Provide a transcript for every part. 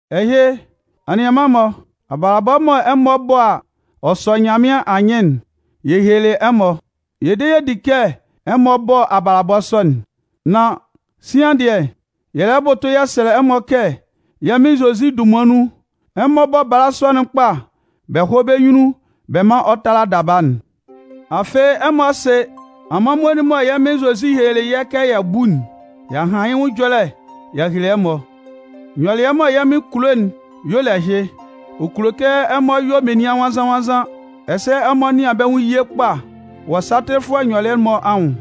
Ɛhɩ, anianman-mɔ, abalabɔ mɔ ɛmɔ bɔ a, ɔ sɔ Nyanmɩan anyɩn'n, yɛ helelɩ ɛmɔ. Yɛ de yɛ di kɛ ɛmɔ bɔ abalabɔ sɔ'n. Nan, sian dɩɛ, yɛ lɛ bʋtʋ yɛ sɛlɛ ɛmɔ kɛ yɛ́ Mɩn Zozi dunman nun, ɛmɔ bɔ́ bala sɔ'n kpa bɛ hɔ́ bɛ́ nyunnun bɛ mán ɔ tála daba'n. Afɩ ɛmɔ sɩ, amanmuo'n mɔ yɛ́ Mɩn Zozi helelɩ yɛ́ kɛ yɛ bú'n, y'a han yɩ́ nwʋn ɛjɔlɛ y'a hele ɛmɔ. Nyɔlɩɛ mɔ Nyanmɩan kulo'n y'ɔ le ɛhɩ: ɔ kulo kɛ ɛmɔ yɔ menian nwannzan-nwannzan, ɛsɛ ɛmɔ nɩan bɛ́ nwʋn ye kpa wɔ satɩlɩfʋɛ nyɔlɩɛ'n-mɔ anwʋn.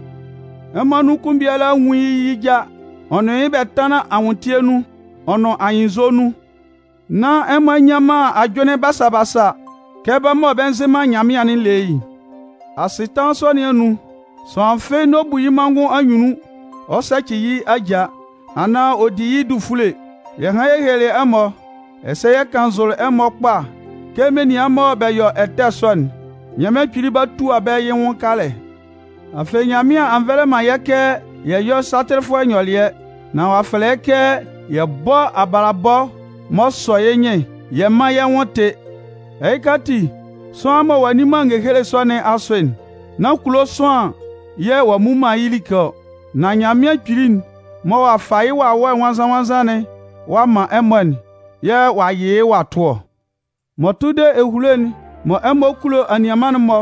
Ɛmɔ anun kʋn biala nwún yɩ́ yɩ já, ɔ nʋn yɩ́ bɛ tánlan anwʋntɩɛ nun, ɔ nʋn anyɩnnzɔ nun, nán ɛmɔ a nnyan man ajʋnlɩn basa basa kɛ bɛ́ mɔ bɛ nzɩ man Nyanmɩan'n le yɩ́'n. Asɩtanlan sɔ nɩn anun, sʋanlan fɩ́ɩ́ n'ɔ bu yɩ́ manngʋn anyunnun ɔ sɛcɩ yɩ́ ajaa, anaan ɔ di yɩ́ dufule. Yɛ hanlɩn yɛ helelɩ ɛmɔ, ɛsɛ yɛ kannzʋlɩ ɛmɔ kpa kɛ menian mɔ bɛ yɔ ɛtɛ sɔ'n, Nyanmɩan Kpili 'ba tua bɛ́ yɩ́ nwʋn kalɛ. Afɩ, Nyanmɩan a nvɛlɛ man yɛ́ kɛ yɛ yɔ́ satɩlɩfʋɛ nyɔlɩɛ, nan ɔ'a fɛlɛ yɛ́ kɛ yɛ bɔ́ abalabɔ m'ɔ sɔ yɩ́ nyɩn yɛ mán yɛ́ nwʋn tɩ́. Ɛhɩka ati, sʋanlan mɔ ɔ'a nni man ngehele sɔ nɩn asʋ'n, nán kulo sʋanlan yɛ̂ ɔ'a mmu man yɩ́ like ɔ, nan Nyanmɩan Kpili'n mɔ ɔ'a fa yɩ́ Wawɛ Nwannzan-nwannzan'n ɔ'a man ɛmɔ'n yɛ̂ ɔ'a yɩ yɩ́ ɔ'a tʋ ɔ. M'ɔ tʋ de ehulo'n mɔ ɛmɔ kulo anianman'n-mɔ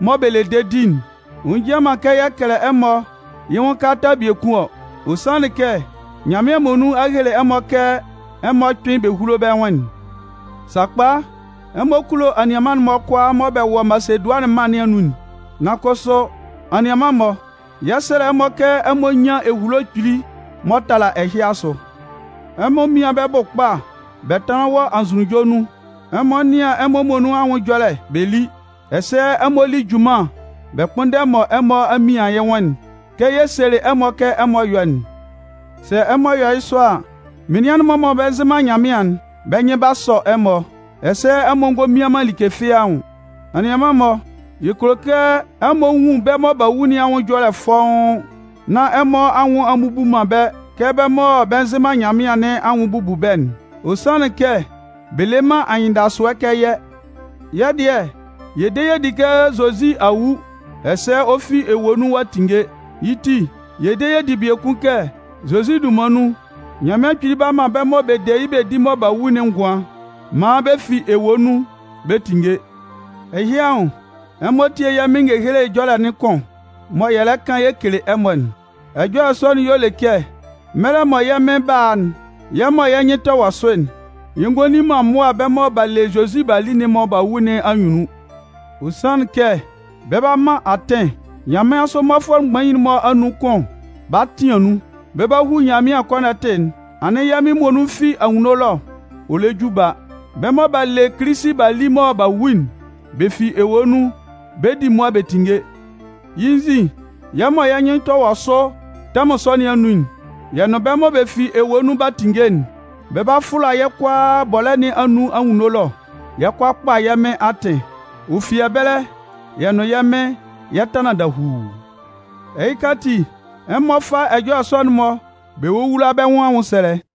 mɔ bɛ le dedi'n, ɔ njian man kɛ yɛ kɛlɛ ɛmɔ yɩ́ nwʋn kalata biekun ɔ. Ɔ sanlɩn kɛ Nyanmɩan muonun a hele ɛmɔ kɛ ɛmɔ kpɩ́n bɛ húlo bɛ́ nwʋn'n. Sakpa, ɛmɔ kulo anianman'n-mɔ kʋalaa mɔ bɛ wɔ Masedʋanɩn mân nɩn anun'n. Nan kʋsʋ, anianman-mɔ, yɛ 'sɛlɛ ɛmɔ kɛ ɛmɔ nyán ehulo kpili m'ɔ tala ɛhɩ asʋ. Ɛmɔ mían bɛ́ bʋ kpa bɛ tánlan wɔ anzʋnunjɔ nun, ɛmɔ nɩ́an ɛmɔ muonun anwʋn ɛjɔlɛ bɛ lí, ɛsɛ ɛmɔ lí junman bɛ kpʋ́nndɛ mɔ ɛmɔ a mɩan yɩ́ nwʋn'n, kɛ yɛ selɩ ɛmɔ kɛ ɛmɔ yɔ́'n. Sɛ ɛmɔ yɔ yɩ́ sɔ a, menian'n-mɔ mɔ bɛ nzɩ man Nyanmɩan'n, bɛ́ nyɩn 'ba sɔ ɛmɔ, ɛsɛ ɛmɔ ngɔ mian man like fɩ́ɩ́ anwʋn. Anianman-mɔ, yɛ kulo kɛ ɛmɔ nwun bɛ́ mɔ b'a wu nɩn anwʋn ɛjɔlɛ'n fɔ́ʋ́n, nán ɛmɔ anwʋn a mmubu man bɛ́ kɛ bɛ́ mɔ bɛ nzɩ man Nyanmɩan nɩn anwʋn bubu bɛ́'n, ɔ sanlɩn kɛ bɛ le man anyɩndasʋɛ kɛ yɛ́. Yɛ́ dɩɛ, yɛ de yɛ di kɛ Zozi a wu, ɛsɛ ɔ fi ewue nun ɔ'a tinnge. Yɩ́ ti, yɛ de yɛ di biekun kɛ Zozi dunman nun, Nyanmɩan Kpili 'ba man bɛ́ mɔ bɛ de yɩ́ bɛ di mɔ b'a wu'n ngʋan maan bɛ fi ewue nun bɛ tinnge. Ɛhɩ anwʋn, ɛmɔ tie yɛ́ Mɩn ngehele ɛjɔlɛ kʋn mɔ yɛ lɛ kan yɛ kele ɛmɔ'n. Ɛjɔlɛ sɔ'n y'ɔ le kɛ mɛlɛ mɔ yɛ́ Mɩn 'ba a'n, yɛ́ mɔ yɛ́ nyɩn tɛ wɔ sʋ'n, yɛ ngɔ li man mʋa bɛ́ mɔ b'a le Zozi b'a li mɔ b'a wu nɩn anyunnun. Ɔ sanlɩn kɛ bɛ 'ba man atɩn, nyanmɩansʋ mmɔfʋɛ mgbain'n-mɔ anun kʋn 'ba tɩan nun, bɛ 'ba hu Nyanmɩan kɔnɔtɩ'n, anɩn yɛ́ Mɩn muonun fi anwunno ɛlɔ ɔ lɛ ju ba. Bɛ́ mɔ b'a le Kilisi b'a li mɔ b'a wu'n, bɛ fi ewue nun bɛ 'di mʋa bɛ tinnge. Yɩ́ nzin, yɛ́ mɔ yɛ́ nyɩn tɛ wɔ sʋ tɛmʋn sɔ nɩn anun'n, yɛ́ nʋn bɛ́ mɔ bɛ fi ewue nun b'a tinnge'n, bɛ 'ba fʋla yɛ́ kʋalaa bɔlɛ́ nɩn anun anwunno ɛlɔ, yɛ 'kɔ a kpa yɛ́ Mɩn atɩn. Ɔ fi ɛbɛlɛ, yɛ́ nʋn yɛ́ Mɩn yɛ 'tanlan dahuu. Ɛhɩka ati, ɛmɔ fá ɛjɔlɛ sɔ'n-mɔ bɛ wówula bɛ́ nwʋn anwʋnsɛlɛ.